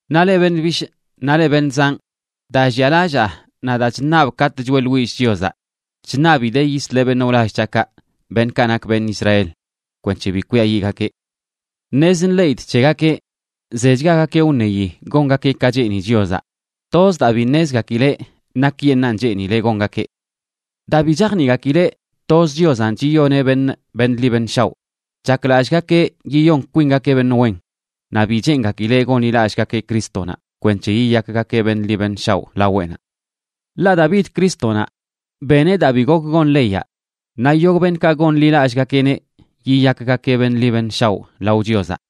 Naꞌ leꞌ beṉꞌ bishꞌ naꞌ leꞌ beṉꞌ zanꞌ, daa llialallaa naꞌ daa chṉabꞌ katꞌ choeꞌḻwillꞌ Chiozaꞌ chṉabidee yisleꞌ beṉꞌ wlall c̱haꞌkaꞌ, beṉꞌkaꞌ nak beṉꞌ Israel, kwenc̱he bi kwiayiꞌgakeꞌ. Ṉez nḻeꞌidꞌ c̱hegakeꞌ zechgagakeꞌ wṉeyi gongakeꞌ ka cheeni Chiozaꞌ, toz daa bi ṉezgakileꞌ nakyeṉꞌan cheenileꞌ gongakeꞌ. Daa bi chajniꞌgakileꞌ toz Chiozanꞌ chiyoneꞌ beṉꞌ beṉꞌ ḻi beṉꞌ shaoꞌ, chaklallꞌgakeꞌ yiyon kwingakeꞌ beṉꞌ wen, naꞌ bi cheengakileꞌ gonḻilallꞌgakeꞌ Crístonaꞌ kwenc̱he yiyakgakeꞌ beṉꞌ ḻi beṉꞌ shaoꞌ laweꞌnaꞌ. Ḻaꞌ daa bid Crístonaꞌ, beneꞌ daa bi gok gon leyaꞌ, naꞌ yogꞌ beṉꞌkaꞌ gonḻilallꞌgakeꞌneꞌ yiyakgakeꞌ beṉꞌ ḻi beṉꞌ shaoꞌ lao Chiozaꞌ.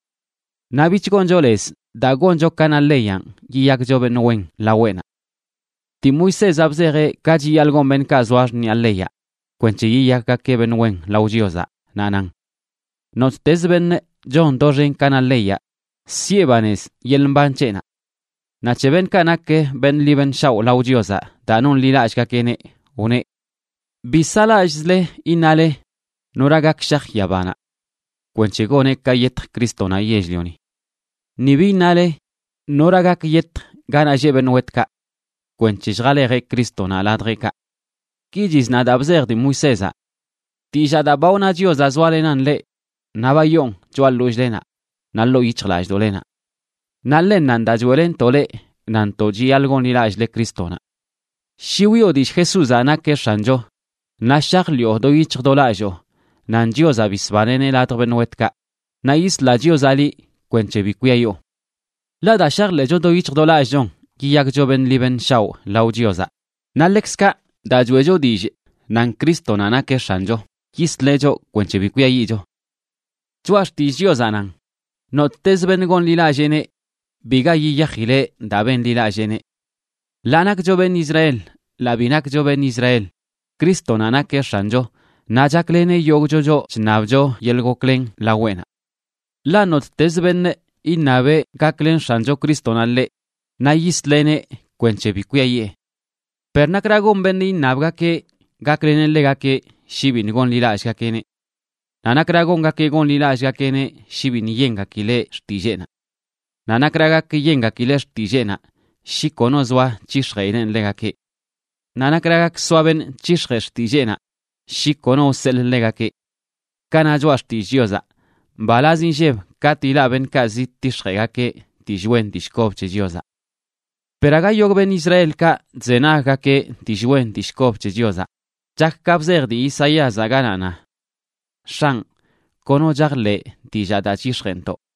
Naꞌ bich goncho lez daa goncho ka na leyanꞌ yiyakcho beṉꞌ wen laweꞌnaꞌ. Dii Moisézaꞌ bzejeꞌ ka chiyaḻꞌ gon beṉꞌkaꞌ zoa xṉiꞌa leyaꞌ kwenc̱he yiyakgakeꞌ beṉꞌ wen lao Chiozaꞌ, naꞌ nan: “Nottezə beṉꞌ chon doxen ka na leyaꞌ siꞌe banez yeḻꞌ mban c̱heꞌnaꞌ.” Naꞌ c̱he beṉꞌkaꞌ nak beṉꞌ ḻi beṉꞌ shaoꞌ lao Chiozaꞌ daa nonḻilallꞌgakeꞌneꞌ, wneꞌ: “Bi saꞌlallꞌzle, iṉale: ¿Nora gak shaj yabanaꞌ?”, (kwenc̱he goneꞌ ka yetj Crístonaꞌ yell-lioni). “Ni bi iṉale: ¿Nora gak yetj ganaꞌ lleꞌ beṉꞌ wetkaꞌ?”, (kwenc̱he lljalejeꞌ Crístonaꞌ ladjeꞌkaꞌ). Ki chizna daa bzej dii Moisézaꞌ: “Dillaa daa ba wna Chiozaꞌ zoalenan leꞌ naꞌ ba yoon choꞌa ḻollꞌlenaꞌ naꞌ ḻoo yic̱hjlallꞌdoꞌlenaꞌ”, naꞌ ḻennanꞌ daa choeꞌlenntoꞌ leꞌ, nantoꞌ chiyaḻꞌ gonḻilallꞌle Crístonaꞌ. Shi wiꞌo dillꞌ Jesúzaꞌ nakeꞌ X̱ancho naꞌ shajḻiꞌo do yic̱hj do lalloo nan Chiozaꞌ bisbaneꞌneꞌ ladj beṉꞌ wetkaꞌ, naꞌ yisla Chiozaꞌ liꞌ kwenc̱he bi kwiayoo. Ḻaꞌ daa shajḻeꞌcho do yic̱hj do lallꞌchon, yiyakcho beṉꞌ ḻi beṉꞌ shaoꞌ lao Chiozaꞌ, naꞌ ḻekzkaꞌ daa choeꞌcho dillꞌ nan Crístonaꞌ nakeꞌ X̱ancho, yisleꞌ choꞌ kwenc̱he bi kwiayiꞌcho. Choꞌa Xtillꞌ Chiozaꞌ nan: “Nottez beṉꞌ gonḻilalleeneꞌ, biga yiyajileꞌ daa benḻilalleeneꞌ.” Ḻaa nakcho beṉꞌ Israel, ḻaa bi nakcho beṉꞌ Israel, Crístonaꞌ nakeꞌ X̱ancho, naꞌ chakleneꞌ yogꞌcho choꞌ chṉabcho yeḻꞌ goklen laweꞌnaꞌ. Ḻaꞌ nottezə beṉꞌ iṉabeꞌ gaklen X̱ancho Crístonaꞌ ḻeꞌ, naꞌ yisleꞌneꞌ kwenc̱he bi kwiayee. Per ¿nakra gon beṉꞌ iṉabgakeꞌ gakleneꞌ ḻegakeꞌ shi biṉꞌ gonḻilallꞌgakeꞌneꞌ? Naꞌ ¿nakra gongakeꞌ gonḻilallꞌgakeꞌneꞌ shi biṉꞌ yengakileꞌ xtilleenaꞌ? Naꞌ ¿nakra gak yengakileꞌ xtilleenaꞌ shi kono zoa c̱hix̱jeꞌileꞌn ḻegakeꞌ? Naꞌ ¿nakra gak soa beṉꞌ c̱hix̱jee xtilleenaꞌ shi kono wseḻꞌ ḻegakeꞌ? Ka na Choꞌa Xtillꞌ Chiozaꞌ: “Mbalaz inlleb katꞌ ilaꞌ beṉꞌkaꞌ zidtix̱jeꞌgakeꞌ dillꞌ wen dillꞌ kob c̱he Chiozaꞌ.” Per aga yogꞌ beṉꞌ Israelkaꞌ chzenaggakeꞌ dillꞌ wen dillꞌ kob c̱he Chiozaꞌ. Chak ka bzej dii Isaíazaꞌ, ganaꞌ na: “X̱anꞌ, kono chajḻeꞌ dillaa daa chyix̱jeꞌntoꞌ.”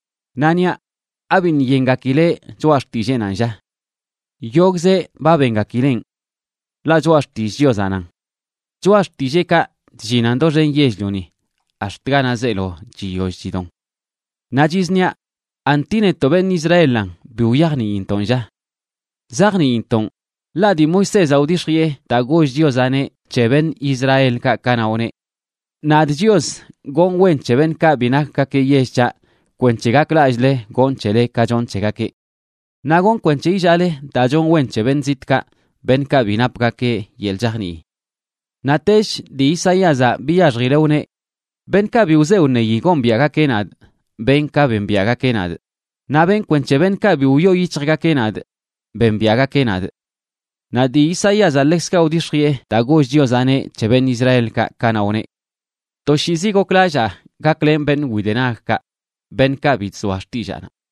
Naꞌ niaꞌ: ¿Abiṉꞌ yengakileꞌ choꞌa xtilleenanꞌ, lla? ¡Yogꞌzeꞌ ba bengakileꞌn! Ḻaꞌ choꞌa xtillꞌ Chiozaꞌ nan: Choꞌa xtilleekaꞌ chllinan doxen yell-lioni ax̱t ganaꞌ zeelo chiyoll chidon. Naꞌ chizniaꞌ, ¿anti netoꞌ beṉꞌ Israelan bi wyajniintoꞌn, lla? Zajniintoꞌn. Ḻaꞌ dii Moisézaꞌ wdix̱jiꞌe daa goll Chiozaꞌneꞌ c̱he beṉꞌ Israelkaꞌ kanaꞌ wneꞌ: Nadꞌ Chios gonꞌ wen c̱he beṉꞌkaꞌ bi nakgakeꞌ yell c̱haꞌ kwenc̱he gaklallꞌle gonꞌ c̱hele ka chonꞌ c̱hegakeꞌ. Naꞌ gonꞌ kwenc̱he illaale daa chonꞌ wen c̱he beṉꞌ zitꞌkaꞌ beṉꞌkaꞌ bi napgakeꞌ yeḻꞌ chajnii. Naꞌtech dii Isaíazaꞌ biyaxjileꞌ wneꞌ: Beṉꞌkaꞌ bi wze wṉeyi gombiaꞌgakeꞌ nadꞌ, benꞌ ka bembiaꞌgakeꞌ nadꞌ. Naꞌ benꞌ kwenc̱he beṉꞌkaꞌ bi wyoo yic̱hjgakeꞌ nadꞌ bembiaꞌgakeꞌ nadꞌ. Naꞌ dii Isaíazaꞌ ḻekzkaꞌ wdix̱jiꞌe daa goll Chiozaꞌneꞌ c̱he beṉꞌ Israelkaꞌ kanaꞌ wneꞌ: “Toshiizi goklallaa gaklen beṉꞌ widenagkaꞌ, beṉꞌkaꞌ bi chzoa xtillaanaꞌ.”